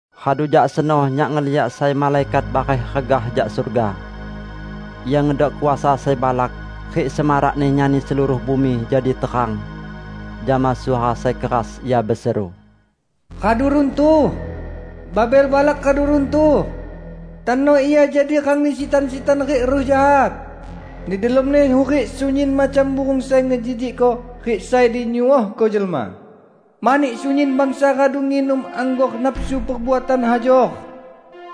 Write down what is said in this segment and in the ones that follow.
Radu jak seno nyak ngeliak sai malaikat bareh regah jak surga. Ia ngedok kuasa sai balak, rik semarakni nyani seluruh bumi jadi terang. Jama suara sai keras, ia beseru, "Radu runtuh! Babel balak radu runtuh! Tano ia jadi rangni sitan-sitan rik ruh jahat. Di delomni hurik sunyin macam burung sai ngejijikko rik sai dinyuohko jelma. Mani sunyin bangsa radu nginum anggor nafsu perbuatan hajor.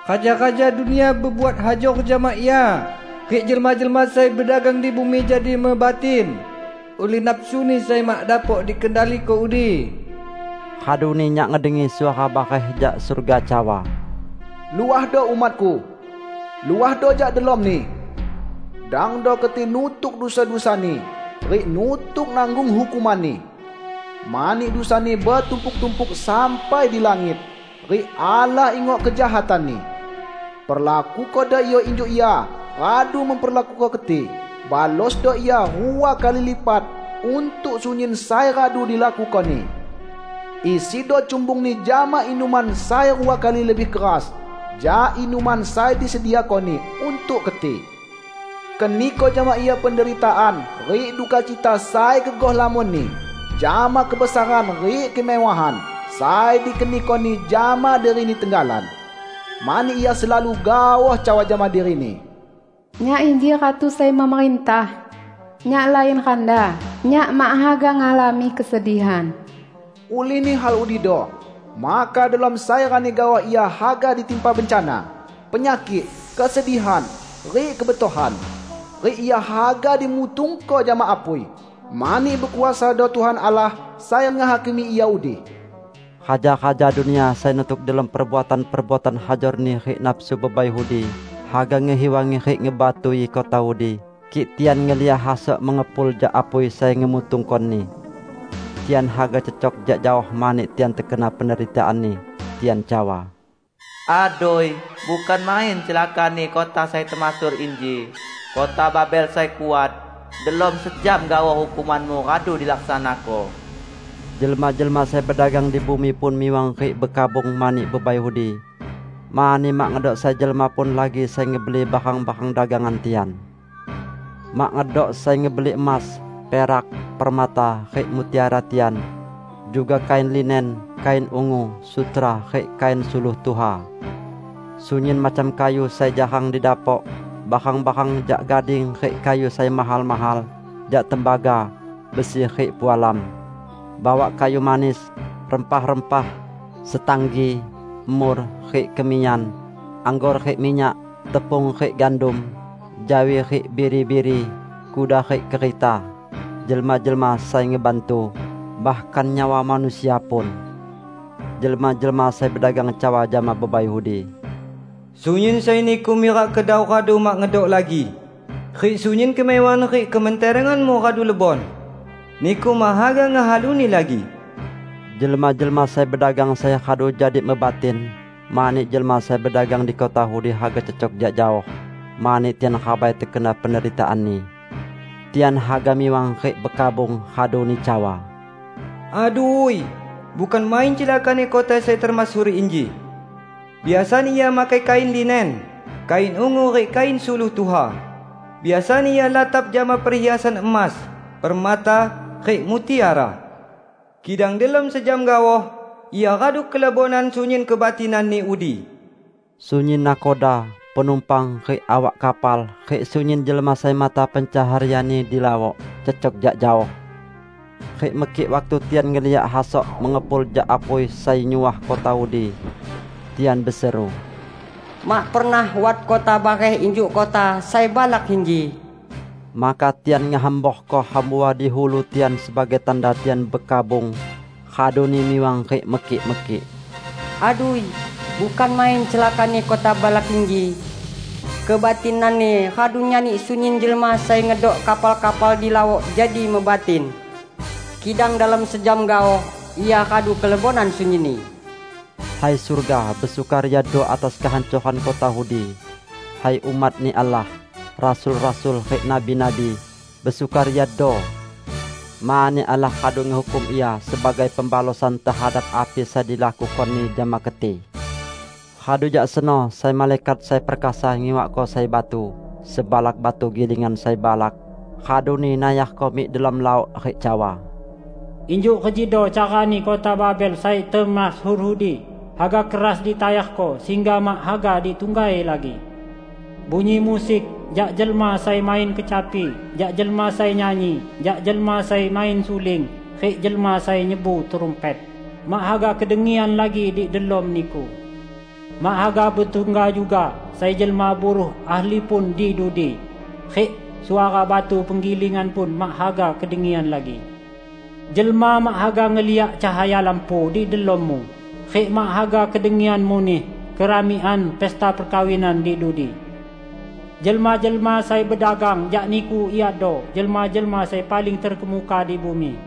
Raja-raja dunia bebuat hajor jama ia, rik jelma-jelma sai bedagang di bumi jadi mebatin ulih nafsuni sai mak dapok dikendaliko udi." Raduni nyak ngedengi suara bareh jak surga cawa, "Luahdo, umat-Ku! Luahdo jak delomni! Dangdo keti nutuk dusa-dusani, rik nutuk nanggung hukumanni! Mani dusani betumpuk-tumpuk sampai di langit, rik Allah ingok kejahatanni. Perlakukodo ia injuk ia radu memperlakuko keti; balosdo ia rua kali lipat untuk sunyin sai radu dilakukoni. Isido cumbungni jama inuman sai rua kali lebih keras jak inuman sai disediakoni untuk keti. Keniko jama ia penderitaan rik duka cita sai gegoh lamonni jama kebesaran rik kemewahan sai dikenikoni jama dirini tenggalan. Mani ia selalu gaoh cawa jama dirini, 'Nyak inji ratu sai memerintah! Nyak lain randa; nyak mak haga ngalami kesedihan!' Ulihni hal udido, maka delom sai rani gaoh ia haga ditimpa bencana -- penyakik, kesedihan, rik kebetohan. Rik ia haga dimutungko jama apui, mani bekuasado Tuhan Allah sai ngehakimi ia udi." Raja-raja dunia sai nutuk delom perbuatan-perbuatan hajorni rik nafsu bebai udi haga ngehiwangi rik ngebatui kota udi kik tian ngeliak hasok mengepul jak apui sai ngemutungkoni. Tian haga cecok jak jaoh mani tian tekena penderitaanni. Tian cawa, "Adui, bukan main celakani kota sai temasyhur inji -- kota Babel sai kuat! Delom sejam gaoh hukumanmu radu dilaksanako!" Jelma-jelma sai bedagang di bumi pun miwang rik bekabung mani bebai udi, mani mak ngedok sai jelma pun lagi sai ngebeli barang-barang dagangan tian. Mak ngedok sai ngebeli emas, perak, permata, rik mutiara tian; juga kain linen, kain ungu, sutra, rik kain suluh tuha; sunyin macam kayu sai jarang didapok, barang-barang jak gading rik kayu sai mahal-mahal, jak tembaga, besi, rik pualam; bawak kayu manis, rempah-rempah, setanggi, mur, rik kemiyan; anggor rik minyak, tepung rik gandum, jawi rik biri-biri, kuda rik kereta, jelma-jelma sai ngebantu, bahkan nyawa manusia pun. Jelma-jelma sai bedagang cawa jama bebai udi, "Sunyin sai niku mirak kedau radu mak ngedok lagi, rik sunyin kemewahan rik kementerenganmu radu lebon. Niku mak haga ngehaluni lagi!" Jelma-jelma sai bedagang sai radu jadi mebatin mani jelma sai bedagang di kota udi haga cecok jak jaoh, mani tian rabai tekena penderitaanni. Tian haga miwang rik bekabung, raduni cawa, "Adui, bukan main celakani kota sai temasyhur inji! Biasani ia makai kain linen, kain ungu rik kain suluh tuha; biasani ia latap jama perhiasan emas, permata, rik mutiara! Kidang delom sejam gaoh, ia radu kelebonan sunyin kebatinanni udi!" Sunyin nakhoda, penumpang, rik awak kapal, rik sunyin jelma sai mata pencaharianni di laok, cecok jak jaoh. Rik mekik waktu tian ngeliak hasok mengepul jak apui sai nyuah kota udi. Tian beseru, "Mak pernah wat kota bareh injuk kota sai balak inji!" Maka tian ngehamborko hambua di ulu tian sebagai tanda tian bekabung, raduni miwang rik mekik-mekik, "Adui, bukan main celakani kota balak inji! Kebatinanni radu nyani sunyin jelma sai ngedok kapal-kapal di laok jadi mebatin! Kidang delom sejam gaoh, ia radu kelebonan sunyinni!" Hai surga, besukariado atas kehancoran kota udi! Hai umat-Ni Allah, rasul-rasul, rik nabi-nabi, besukariado! Mani Allah radu ngehukum ia sebagai pembalosan tehadap api sai dilakukoni jama keti! Radu jak seno sai malaikat sai perkasa ngiwakko sai batu -- sebalak batu gilingan sai balak -- raduni nayarko mik delom laok rik cawa, "Injuk rejido carani kota Babel sai temasyhur udi haga keras ditayarko sehingga mak haga ditunggai lagi. Bunyi musik jak jelma sai main kecapi, jak jelma sai nyanyi, jak jelma sai main suling rik jelma sai nyebu trumpet, mak haga kedengian lagi di delom niku! Mak haga betungga juga sai jelma buruh ahli pun di dudi, rik suara batu penggilingan pun mak haga kedengian lagi. Jelma mak haga ngeliak cahaya lampu di delommu; rik mak haga kedengian muneh keramikan pesta perkawinan di dudi. Jelma-jelma sai bedagang jak niku iado jelma-jelma sai paling terkemuka di bumi,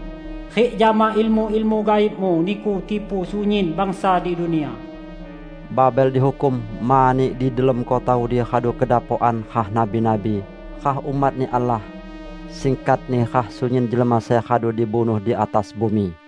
rik jama ilmu-ilmu gaibmu niku tipu sunyin bangsa di dunia!" Babel dihukum mani di delom kota udi radu kedapokan rah nabi-nabi, rah umat-Ni Allah -- singkatni rah sunyin jelma sai radu dibunuh di atas bumi!